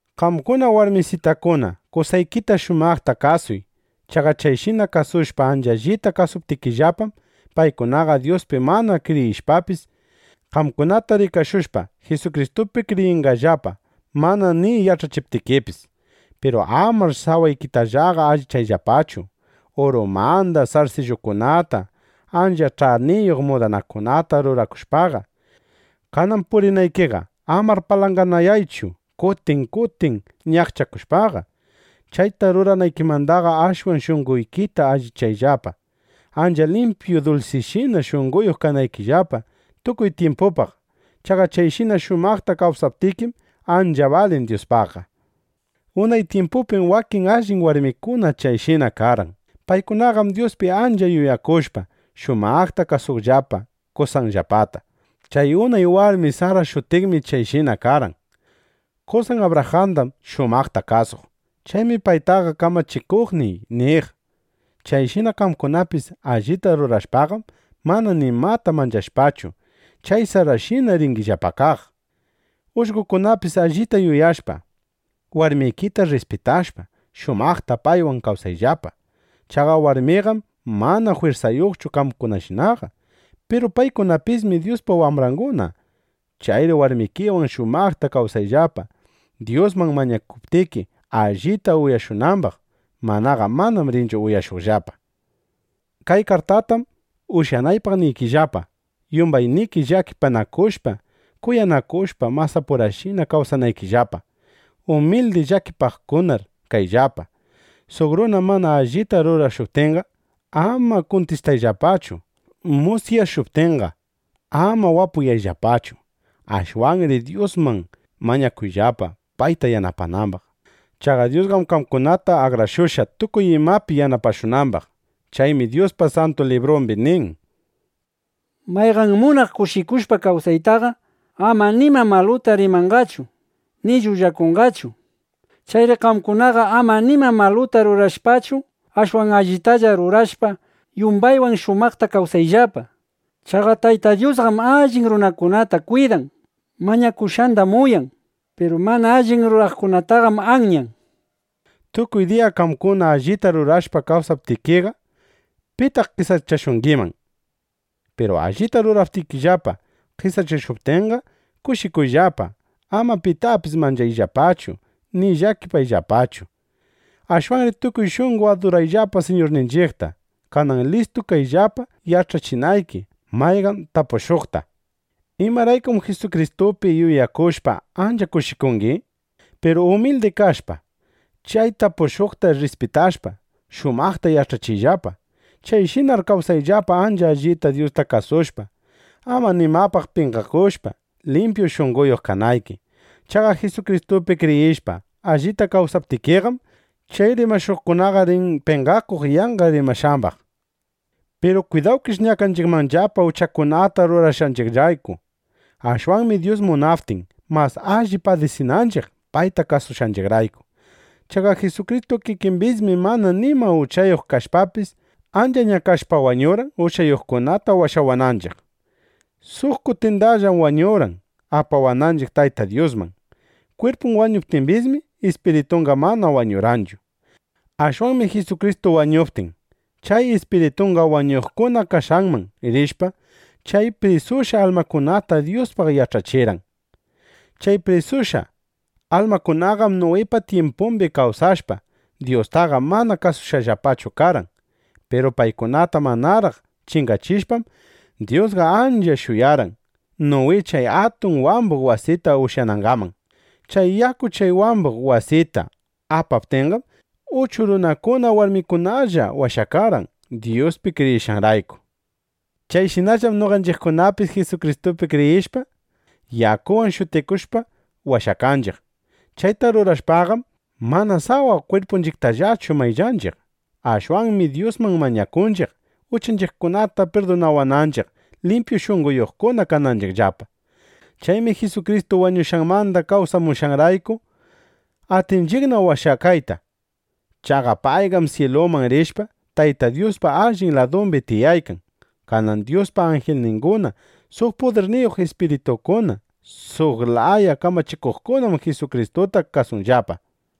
Qamkuna warmisitakuna, qosaykita shumaqta kasuy. Chaqa chayshina kasushpa ancha allita kawsaptikillapam, paykunaqa Dyuspi mana kriyishpapis, qamkunata rikashushpa, Jisukristupi kriyinqallapa, mana ni yach'achiptikipis. Piru amar sawaykitallaqa allichayllapachu, urumanda sarsillukunata, ancha ch'aniyuq mudanakunata rurakushpaqa. Kanan purinaykiqa, amar palanganayaychu kutin kutin ñaqchakushpaqa. Chayta ruranaykimandaqa ashwan shunqoykita allichayllapa, ancha limpyu dulsishina shunqoyuq kanaykillapa tukuy tyimpupaq. Chaqa chayshina shumaqta kawsaptikim, ancha balin Dyuspaqqa. Unay tyimpupim wakin allin warmikuna chayshina karqan. Paykunaqam Dyuspi ancha yuyakushpa, shumaqta kasuqllapa qosanllapata. Chay unay warmi Sara shutiqmi chayshina karqan. Qosan Abrajandam shumaqta kasuq. Chaymi paytaqa “Kamachikuqniy” niq. Chayshina qamkunapis allita rurashpaqam, mana nimata manchashpachu, chay Sarashina ringillapa kaq. Ullqokunapis allita yuyashpa, warmikita rrispitashpa, shumaqta paywan kawsayllapa. Chaqa warmiqam mana jwirsayuqchu qamkunashinaqa. Piru paykunapismi Dyuspa wambranguna. Chayri warmikiwan shumaqta kawsayllapa, Dyusman mañakuptiki, allita uyashunambaq. Manaqa manam rinchu uyashuqllapa. Kay kartaytam ushyanaypaq niykillapa, yumbayniki llakipanakushpa, kuyanakushpa masapurashina kawsanaykillapa. Umildi llakipakuqkunar kayllapa. Suq runa mana allita rurashuptinqa, ama kutichiyllapachu. Musyashuptinqa, ama wapuyayllapachu. Ashwanri Dyusman mañakuyllapa, payta yanapanambaq. Chaqa Dyusqam qamkunata akrashushqa, tukuy imapi yanapashunambaq. Chaymi Dyuspa Santu Librumbi nin: Mayqan munaq kushikushpa kawsaytaqa ama nima maluta rimanqachu, ni llullakunqachu. Chayri qamkunaqa ama nima maluta rurashpachu, ashwan allitalla rurashpa, yumbaywan shumaqta kawsayllapa. Chaqa Tayta Dyusqam allin runakunata kwidan. Mañakushqandam uyan. Piru mana alli ruraqkunataqam anyan, nishpa. Tukuy diya qamkuna allita rurashpa kawsaptikiqa, ¿pitaq qesachashungiman? Piru allita ruraptikillapa qesachashuptinqa, kushikuyllapa. Ama pitapis manchayllapachu ni llakiyllapachu. Ashwanri tukuy shunqo adurayllapa Siñurninchiqta. Kanan listu kayllapa yach'achinayki mayqan tapushuqta: “¿Imaraykum Jisukristupi yuyakushpa, ancha kushikungi?” nishpa. Piru umildi kashpa, chay tapushuqta rrispitashpa, shumaqta yach'achiyllapa. Chayshinar kawsayllapa ancha allita Dyusta kasushpa, ama nimapaq penqakushpa, limpyu shunqoyuq kanayki. Chaqa Jisukristupi kriyishpa, allita kawsaptikiqam, chay rimashuqkunaqa rin penqakuq yanqa rimashqambaq. Piru kwidawkish ñakanchiqmanllapa uchakunata rurashqanchiqrayku. Ashwanmi Dyus munaptin, mas alli padisinanchiq payta kasushqanchiqrayku. Chaqa Jisukristu kikimbismi mana nima uchayuq kashpapis, ancha ñakashpa, wañurqan, uchayuqkunata washawananchiq. Suq kutindallam wañurqan, apawananchiq Tayta Dyusman. Kwirpun wañuptimbismi, ispiritunqa mana wañurqanchu. Ashwanmi Jisukristu wañuptin, chay ispiritunqa wañuqkuna kashqanman rishpa chay prisushqa almakunata Dyuspaq yach'achirqan. Chay prisushqa almakunaqam Nuwipa tyimpumbi kawsashpa, Dyustaqa mana kasushqallapachu karqan. Piru paykunata manaraq chingachishpam, Dyusqa ancha shuyarqan, Nuwi chay atun wambuq wasita ushyanangaman. Chay yaku chay wambuq wasita apaptinqam, uchu runakuna warmikunalla washakarqan, Dyuspi kriyishqanrayku. Chayshinallam noqanchiqkunapis Jisukristupi kriyishpa, yakuwan shutikushpa, washakanchiq. Chayta rurashpaqam, mana sawa kwirpunchiqtallachu mayllanchiq. Ashwanmi Dyusman mañakunchiq, uchanchiqkunata pirdunawananchiq, limpyu shunqoyuqna kananchiqllapa. Chaymi Jisukristu wañushqanmanda kawsamushqanrayku, atinchiqna washakayta. Chaqa payqam syiluman rishpa, Tayta Dyuspa allin ladumbi tiyaykan. Kanan Dyuspa anjilninguna, suq pudirniyuq ispiritukuna, suq laya kamachikuqkunam Jisukristuta kasunllapa.